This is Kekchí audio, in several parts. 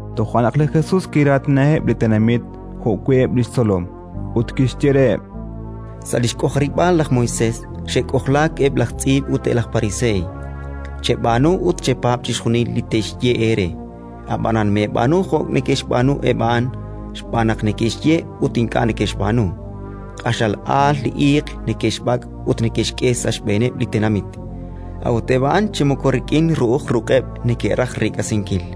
Toja' naq li Jesus kiraatinaheb' li tenamit jo'wi' eb' li xtzolom, ut kixye reheb': “Sa' li xk'ojarib'aal laj Moisés xe'k'ojlaak eb' laj tz'iib' ut eb' laj pariseey. Cheb'aanu ut chepaab' chixjunil li te'xye eere, ab'anan meeb'aanu jo' neke'xb'aanu eb' a'an, xb'aan naq neke'xye ut ink'a' neke'xb'aanu. Q'axal aal li iiq neke'xb'ak' ut neke'xk'e sa' xb'eeneb' li tenamit, a'ut eb' a'an chi moko rik'in ru'uj ruq'eb' neke'raj reek'asinkil.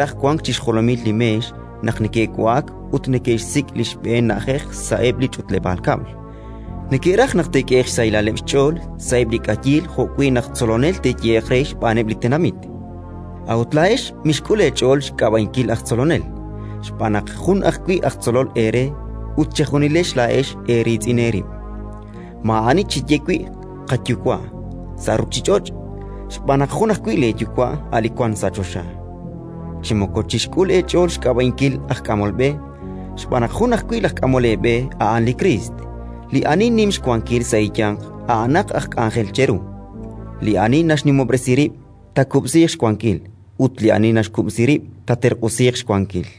neke'raj wank chi xjolomil li meex naq neke'wa'ak ut neke'xsik' li xb'een na'ajej sa'eb' li ch'utleb'aal kab'l; neke'raj naq te'k'ehe'q xsahilaleb' xch'ool sa'eb' li k'ayiil, jo'wi' naq «Tzolonel» te'yehe'q re xb'aaneb' li tenamit. “A'ut laa'ex mixk'ul eech'ool xk'ab'a'inkil aj tzolonel, xb'aan naq jun ajwi' laj Tzolol eere ut chejunilex laa'ex eeriitz'in eerib'. Maa'ani cheye wi' «Qayuwa'» sa' ruuchich'och', xb'aan naq jun ajwi' leeYuwa', a' li wank sa' choxa. Chi moko chixk'ul eech'ool xk'ab'a'inkil aj k'amol b'e, xb'aan naq jun ajwi' laj K'amol eeb'e, a'an li Kriist. Li ani nim xwankil sa' eeyanq a'anaq aj k'anjel cheru. Li ani naxnimob'resi rib', taakub'siiq xwankil, ut li ani naxkub'si rib', taaterq'usiiq xwankil.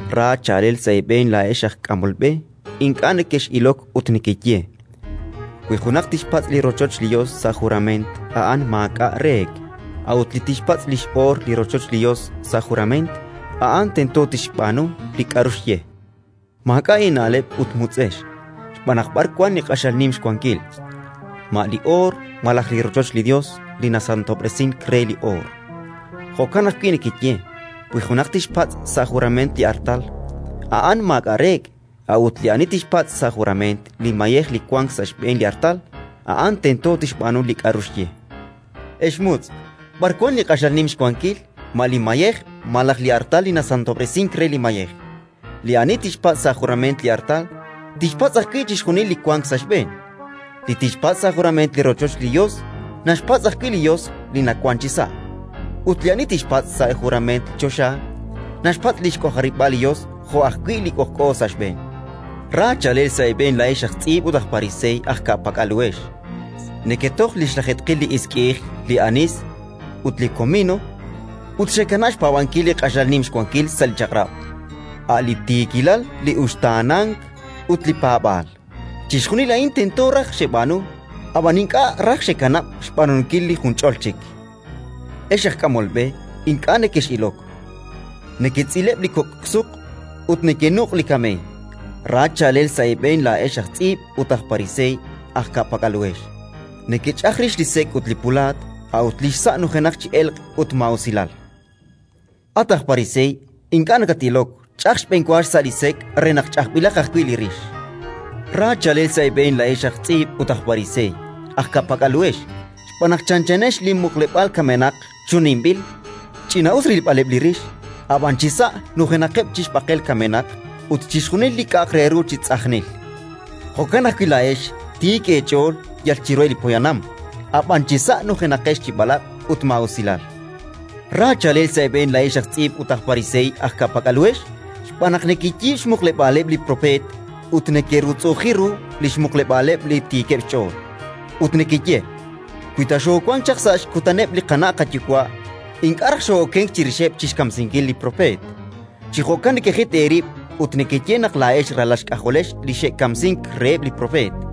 “Ra chaalel sa' eeb'een laa'ex aj k'amol b'e, ink'a' nekex'ilok ut nekeye: «Wi junaq tixpatz' li rochoch li Yos sa' jurament, a'an maak'a' reek'; a'ut li tixpatz' li x'oor li rochoch li Yos sa' jurament, a'an tento tixb'aanu li k'aru xye». Maak'a' eena'leb' ut mutz'ex, xb'aan naq b'ar wank li q'axal nim xwankil: ma li oor malaj li rochoch li Yos li nasantob'resink re li oor? Jo'kan ajwi' nekeye: «Wi junaq tixpatz' sa' jurament li artal, a'an maak'a' reek'; a'ut li ani tixpatz' sa' jurament li mayej li wank sa' xb'een li artal, a'an tento tixb'aanu li k'aru xye». Ex mutz'! B'ar wank li q'axal nim xwankil: ma li mayej malaj li artal li nasantob'resink re li mayej? Li ani tixpatz' sa' jurament li artal, tixpatz' ajwi' chixjunil li wank sa' xb'een. Li tixpatz' sa' jurament li rochoch li Yos, naxpatz' ajwi' li Yos li nawank chisa'. Ut li ani tixpatz' sa' jurament li choxa, naxpatz' li xk'ojarib'aal li Yos jo' ajwi' Li k'ojk'o sa' xb'een. “Ra chaalel sa' eeb'een laa'ex aj tz'iib' ut aj Pariseey aj ka'pak'al uhex: neketoj li xlajeetqil li isk'i'ij, li anis ut li komino, ut xekanab' xpaab'ankil li q'axal nim xwankil sa' li Chaq'rab': a' li tiikilal, li uxtaanank ut li paab'aal! Chixjunil a'in tento raj xeb'aanu, ab'an ink'a' raj xekanab' xb'aanunkil li junch'ol chik. Ex aj k'amol b'e ink'a' nekex'ilok! Neketz'ileb' li kok' suq ut nekenuq' li kameey! “Ra chaalel sa' eeb'een laa'ex aj tz'iib' ut aj Pariseey aj ka'pak'al uhex: nekech'aj rix li sek' ut li pulaat, a'ut li xsa' nujenaq chi elq' ut maa'usilal! At aj Pariseey ink'a' nakat-ilok, ch'aj xb'enwa xsa' li sek' re naq ch'ajb'ilaq ajwi' li rix! “Ra chaalel sa' eeb'een laa'ex aj tz'iib' ut aj Pariseey aj ka'pak'al uhex, xb'aan naq chanchanex li muqleb'aal kamenaq chuninbil: ch'ina'us rilb'aleb' li rix, ab'an chisa' nujenaqeb' chi xb'aqel kamenaq ut chixjunil li k'a'aq re ru chi tz'ajnil! Jo'kan ajwi' laa'ex, tiik eech'ool yal chiruheb' li poyanam, ab'an chisa' nujenaqex chi b'alaq' ut maa'usilal! “Ra chaalel sa' eeb'een laa'ex aj tz'iib' ut aj Pariseey aj ka'pak'al uhex, xb'aan naq nekeyiib' xmuqleb'aaleb' li propeet ut nekerutz'u'uji ru li xmuqleb'aaleb' li tiikeb' xch'ool, ut nekeye: «Wi ta xoowank chaq sa' xkutaneb' li qana' qayuwa', ink'a' raj xoo'okenk chirixeb' chi xkamsinkileb' li propeet!». Chi jo'kan nekejit eerib' ut nekeye naq laa'ex ralal xk'ajolex li xe'kamsink reheb' li propeet.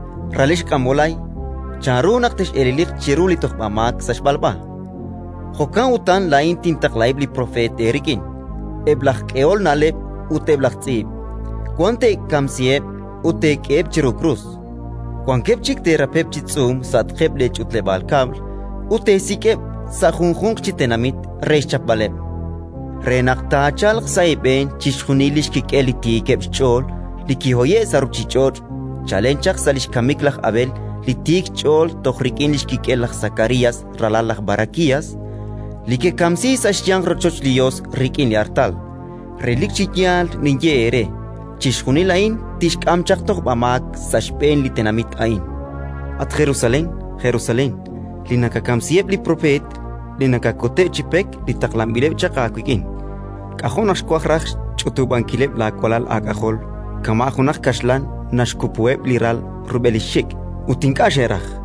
“Ex k'anti', ralex q'anb'olay! Chanru naq tex'eleliq chiru li tojb'amaak sa' xb'alb'a? Jo'kan utan laa'in tintaqlaheb' li propeet eerik'in, eb' laj k'ehol na'leb' ut eb' laj tz'iib': wan teekamsiheb' ut teek'eheb' chiru krus, wankeb' chik teerapeb' chi tz'uum sa'atqeb' leech'utleb'aal kab'l ut teesik'eb' sa' junjunq chi tenamit re xchapb'aleb', re naq taachalq sa' eeb'een chixjunil li xkik'el li tiikeb' xch'ool li kihoye'k sa' ruuchich'och' chalen chaq sa' li xkamik laj Abel li tiik xch'ool toj rik'in li xkik'el laj Sakarías, ralal laj Barakías, li kekamsi sa' xyanq rochoch li Yos rik'in li artal. Relik chi yaal ninye eere: chixjunil a'in tixk'am chaq tojb'amaak sa' xb'een li tenamit a'in. “At Jerusalén, Jerusalén, li nakakamsiheb' li propeet ut nakakuteb' chi pek li taqlanb'ileb' chaq aawik'in! K'ajo' naq xwaj raj xch'utub'ankileb' laawalal aak'ajol, kama' junaq kaxlan naxkupuheb' li ral rub'el li xxik', ut ink'a' xeraj!